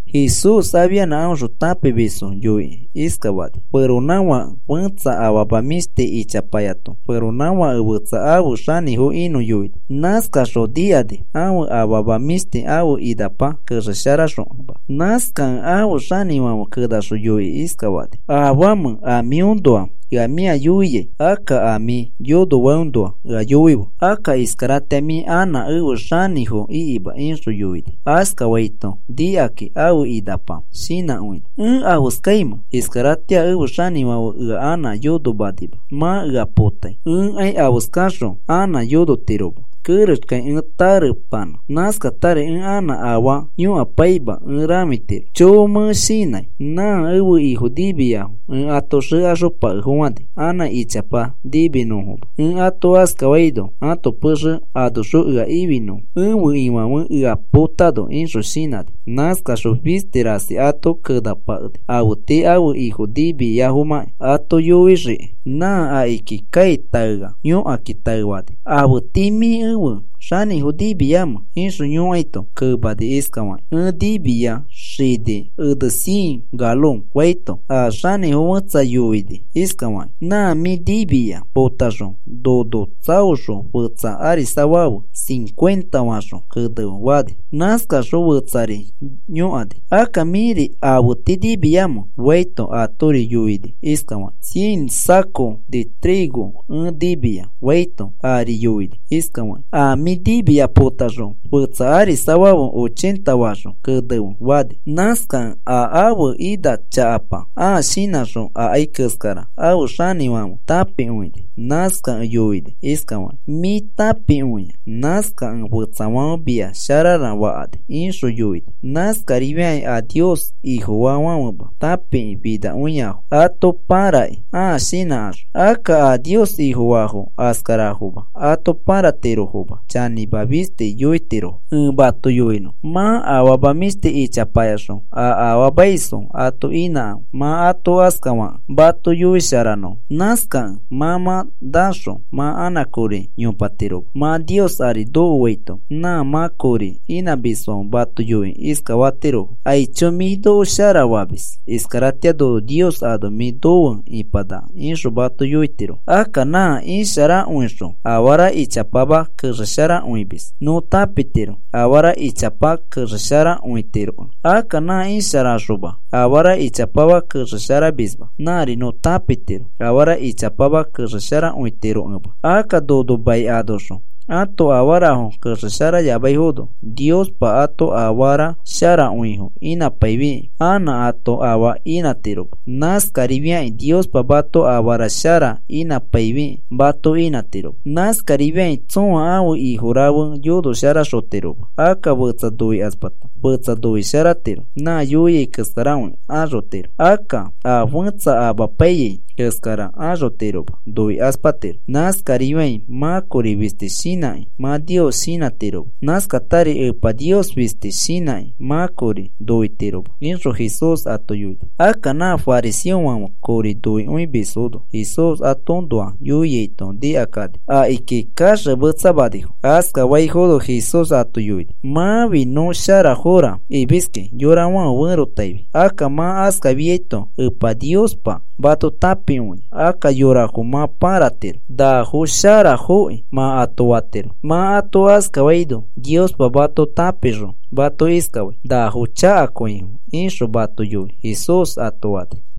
Jesús afianã aõxõ tãpimisfo yoikĩ iskafani: “Feronãfake fetsa afama mĩshti ichapayato feronãfake fetsa afe xanĩfo inõ yoini. Nãskaxõ nikani ãfe afama mĩshti ãfe inapa kexesharaxokẽma. Nãskakẽ ãfe xanĩfãfe kenaxõ yoikĩ iskafani: ‘¿Afamẽ a mĩõnoa ea mĩa yoiai? Akka a mĩ yonofaiõnoa ea yoife. Akka iskaratĩa mĩ anã efe xanĩfo ikima,’ ixõ yoini. “Askafaito nikakĩ ãfe inapa shinãkõini: ‘¿Ẽ afeskaimẽ? Iskaratĩa ẽfe xanĩfãfe ea anã yonomanima, mã ea potai. Ẽkai afeskaxõ anã yonotiroma kerexkai ẽ tarepanã. Nãskatari ẽ anã afaa yõkapaima ẽ rãfitiro. ¡Choo! Mẽ shinãi. Nã ẽfe ifo nimiyafo ẽ ato xekaxopakefofãni anã ichapa niminõfoma. Ẽ ato askafaino ãto pexe anoxõ ea ifinõfo ẽfe ifãfe ea potano,’ ixõ shinãni. “Nãskaxõ fisti rasi ato kenapakeni afe tii ãfe ifo nimiafomãki ato yoixiki. Nã akiki kai taea yõkakĩ taefani: ‘¿Afe tii mĩ ẽfe xanĩfo nimiamẽ?’ ixõ yõikaito, kemani iskafakĩ: ‘Ẽ nimia xini ene cien galon,’ faito, a xanĩfo fẽtsa yoini iskafakĩ: ‘Nã mĩ nimia potaxõ nono tsaoxõ fetsa arisafafe cincuenta faxõ kenefe,’ fani. “Nãskaxõ fetsari yõkani: ‘Akka mĩri, ¿afe tii nimiamẽ?’ faito, atori yoini iskafakĩ: ‘Cien saco de trigo ẽ nimia,’ faito, ari yoini iskafakĩ: ‘A mĩ nimia potaxõ fetsa arisafafe ochenta faxõ kenefe,’ fani. “Nãskakẽ a ãfe ina chakapa ãa shinãxõ akai keskara ãfe xanĩfãfe tãpikõini. Nãskakẽ yoini iskafaki: ‘Mĩ tãpikõia, nãskakẽ fetsafãfe mia sharara fakani,’ ixõ yoini. Nãskarifiakĩ a Nios Ifofaafãfema tãpikĩ finakõiafo ato pãrakĩki, ãa shinãkaxõ. Akka a Nios Ifofaafo askarafoma, ato pãratirofoma. Chanĩma fisti yoitirofo. “Ẽ mato yoinõ, mã afama mĩshti ichapayaxõ a afaamaisfo ato inãkãfe, mã ato askafakẽ mato yoisharanõfo. Nãskakẽ mã mã naxõ mã anã kori yopatiroma mã Nios ari nokoaito nã mã kori inãmisfãfe mato yoikĩ iskafatirofo: ‘Aicho, mĩ noko shara famis. Iskaratĩa nono Nios ano mĩ nofe ipanaka,’ ixõ mato yoitirofo. “Akka nã isharakõixõ afara ichapama kexesharakõimis nõ tãpitiro afara ichapa kexesharakõitirokẽ. Akka nã isharaxoma afara ichapama kexesharamisma nãri nõ tãpitiro afara ichapa kexesharakõitirokẽma. Akka nono mai anoxõ ãto afarafo kexesharayamaifono, Niospa ato afara sharakõifo inãpaifikĩ anã ato afaa inãtiroma. Nãskarifiakĩ Niospa mato afara shara inãpaifikĩ mato inãtiroma. “Nãskarifiakĩ tsõa ãfe ifo rafe yonoxosharatiroma. Akka fetsa noikaspata fetsa noisharatiro, nã yoiai keskarakõi axotiro, akka a fẽtsa amapaiyai keskara axotiroma noikaspatiro. Nãskarifiakĩ mã kori fisti shinãkĩ mã Nios shinãtiroma. Nãskatari Epa Nios fisti shinãkĩ mã kori noitiroma,” ixõ Jesús ato yoini. Akka nã fariseofãfe kori noikõimisfono Jesús atoõnoa yoiaito nikakani akiki kaxemetsamanifo. Askafaifono Jesús ato yoini: “Mãfi nõ sharafora imiski yorafãfe ferotaifi, akka mã askafiaito Epa Niospa mato tãpikõia. Akka yorafo mã pãratiro nafo sharafoki mã ato fatiro, mã ato askafaino Niospa mã mato tãpixõ mato iskafai: ‘Nafo chakakõifo,’ ixõ mato yoi,” Jesús ato fani.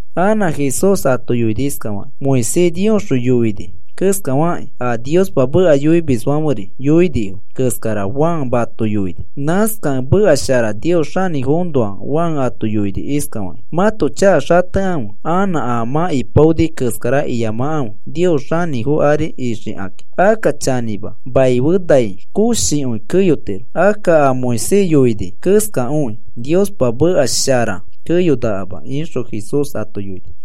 Anã Jesús ato yoini iskafakĩ: “Moisés Niosxõ yoini keskafakĩ, a Niospa meka yoimisfãferi yoinifo keskara Juan mato yoini. Nãskakẽ meka shara Nios xanĩfoõnoa Juan ato yoini iskafaki: ‘Mãto chaka xatekãfe anã a mã ipaoni keskara iyamakãfe Nios xanĩfo ari ikixakakĩ.’ “Akka chanĩma, maife nai koshikõi keyotiro. Akka a Moisés yoini keskakõi, Niospa meka shara keyonakama,” ixõ Jesús ato yoini.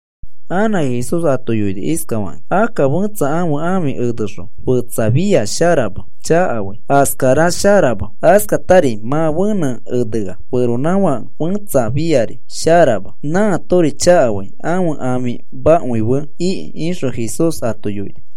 Anã Jesús ato yoini iskafakĩ: “Akka fẽtsa ãfe ãfi enexõ, fetsa fia sharama. Chakafai. Askara sharama. Askatari mã fenẽ enea feronãfake fẽtsa fĩari sharama. Nãatori chakafai ãfe ãfimakõi fe ikĩ,” ixõ Jesús ato yoini.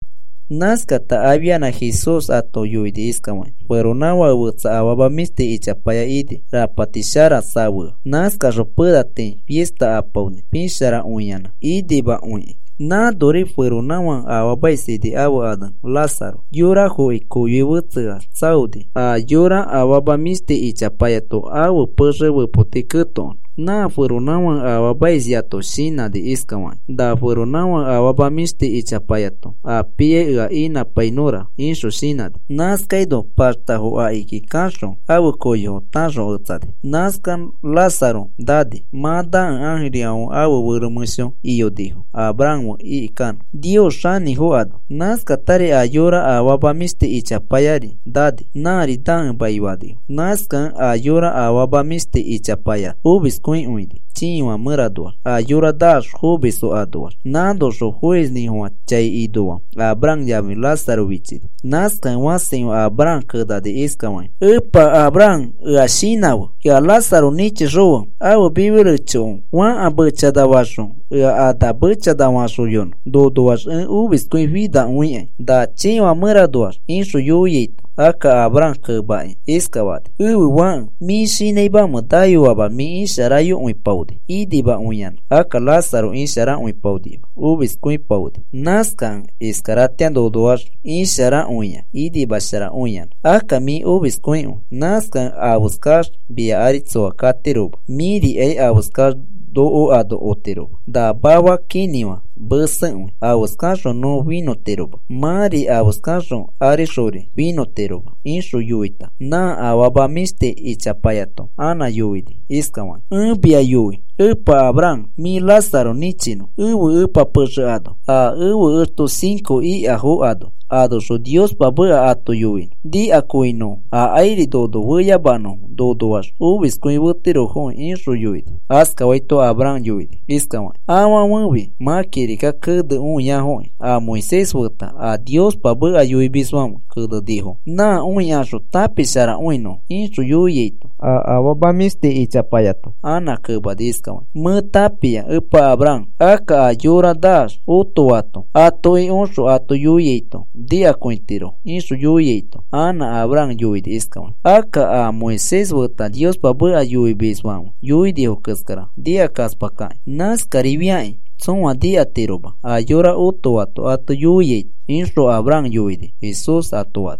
Nãskata afianã Jesús ato yoini iskafakĩ: “Feronãfake fetsa afama mĩshti ichapaya ini, rapati sharakõi safea. Nãskaxõ pena tii fista apaoni pisharakõiyanã inimakõikĩ. Nãnori feronãfake afaamais ini ãfe ane Lázaro, yorafoki koyoi fetseax tsaoni a yora afama mĩshti ichapayato ãfe pexe fepoti ketokonõ. Nã feronãfake afaamaisyato shinãni iskafakĩ: ‘Na feronãfake afama mĩshti ichapayato a piai ea inãpainõra,’ ixõ shinãni. Nãskaino paxtafo akiki kaxõ ãfe koyofo tãxoketsani. “Nãskax Lázaro nani. Mã nakẽ ãjirifãfe ãfe fero mẽsho iyonifo Abraham fe ikikanõ Nios xanĩfo ano. Nãskatari a yora afama mĩshti ichapayari nani. Nãri nakẽ maifanifo. Nãskakẽ a yora afama mĩshti ichapaya omiskõikõini chiifã mẽranoax a yorafo naax fomisfo anoax. Nãnoxõ foisnĩfofã chai inoa Abraham yafi Lázaro fichini. Nãskakẽ fãsikõi Abraham kenani iskafaki: ‘¡Epa Abraham, ea shinãfe! Ea Lázaro nĩchixõfe ãfe mifi rechoko fãka mechanafaxõ ea ana mechana faxoyonõ. Nonoax ẽ omiskõi finakõikai na chiifã mẽranoax,’ ixõ yoiaito, akka Abraham kemakĩ iskafani: ‘Ẽfe fãke, ¿mĩ shinãimamẽ nayoamax mĩ isharakõiyopaoni inimakõiyanã? Akka Lázaro isharakõipaonima. Omiskõipaoni. Nãskakẽ iskaratĩa nonoax isharakõia inimasharakõiyanã, akka mĩ omiskõikõi. Nãskakẽ afeskax mia ari tsoa katiroma, mĩrikai afeskax noko ano otiroma. Na mafa kinĩfã mesekõi afeskaxõ nõ finõtiroma. Mãri afeskaxõ arixori finõtiroma,’ ixõ yoiaito, nã afama mĩshti ichapayato anã yoini iskafakĩ: ‘Ẽ mia yoi epa Abraham mĩ Lázaro nĩchinõ ẽfe ẽpa pexe ano a ẽfe exto cinco ikafo ano, anoxõ Niospa meka ato yoinõ nikakõinõfo akairi nono feyamanõfo nonoax omiskõi fetirofoki,’ ixõ yoini. “Askafaito Abraham yoini iskafakĩ: ‘Afãfefi mã kirika kene õiafoki a Moisés feta a Niospa meka yoimisfãfe kenenifo. Nã õikaxõ tãpisharakõinõfo,’ ixõ yoiaito, a afama mĩshti ichapayato anã kemani iskafakĩ: ‘Mẽ tãpia, Epa Abraham, akka a yora naax otoato atoki oxõ ato yoiaito nikakõitirofo,’ ixõ yoiaito, anã Abraham yoini iskafakĩ: ‘Akka a Moisés feta Niospa meka yoimisfãfe yoinifo keskara nikakaspakaki. Nãskarifiakĩ tsõa nikatiroma a yora otoato ato yoiaito,’ ixõ Abraham yoinino,” Jesús ato fani.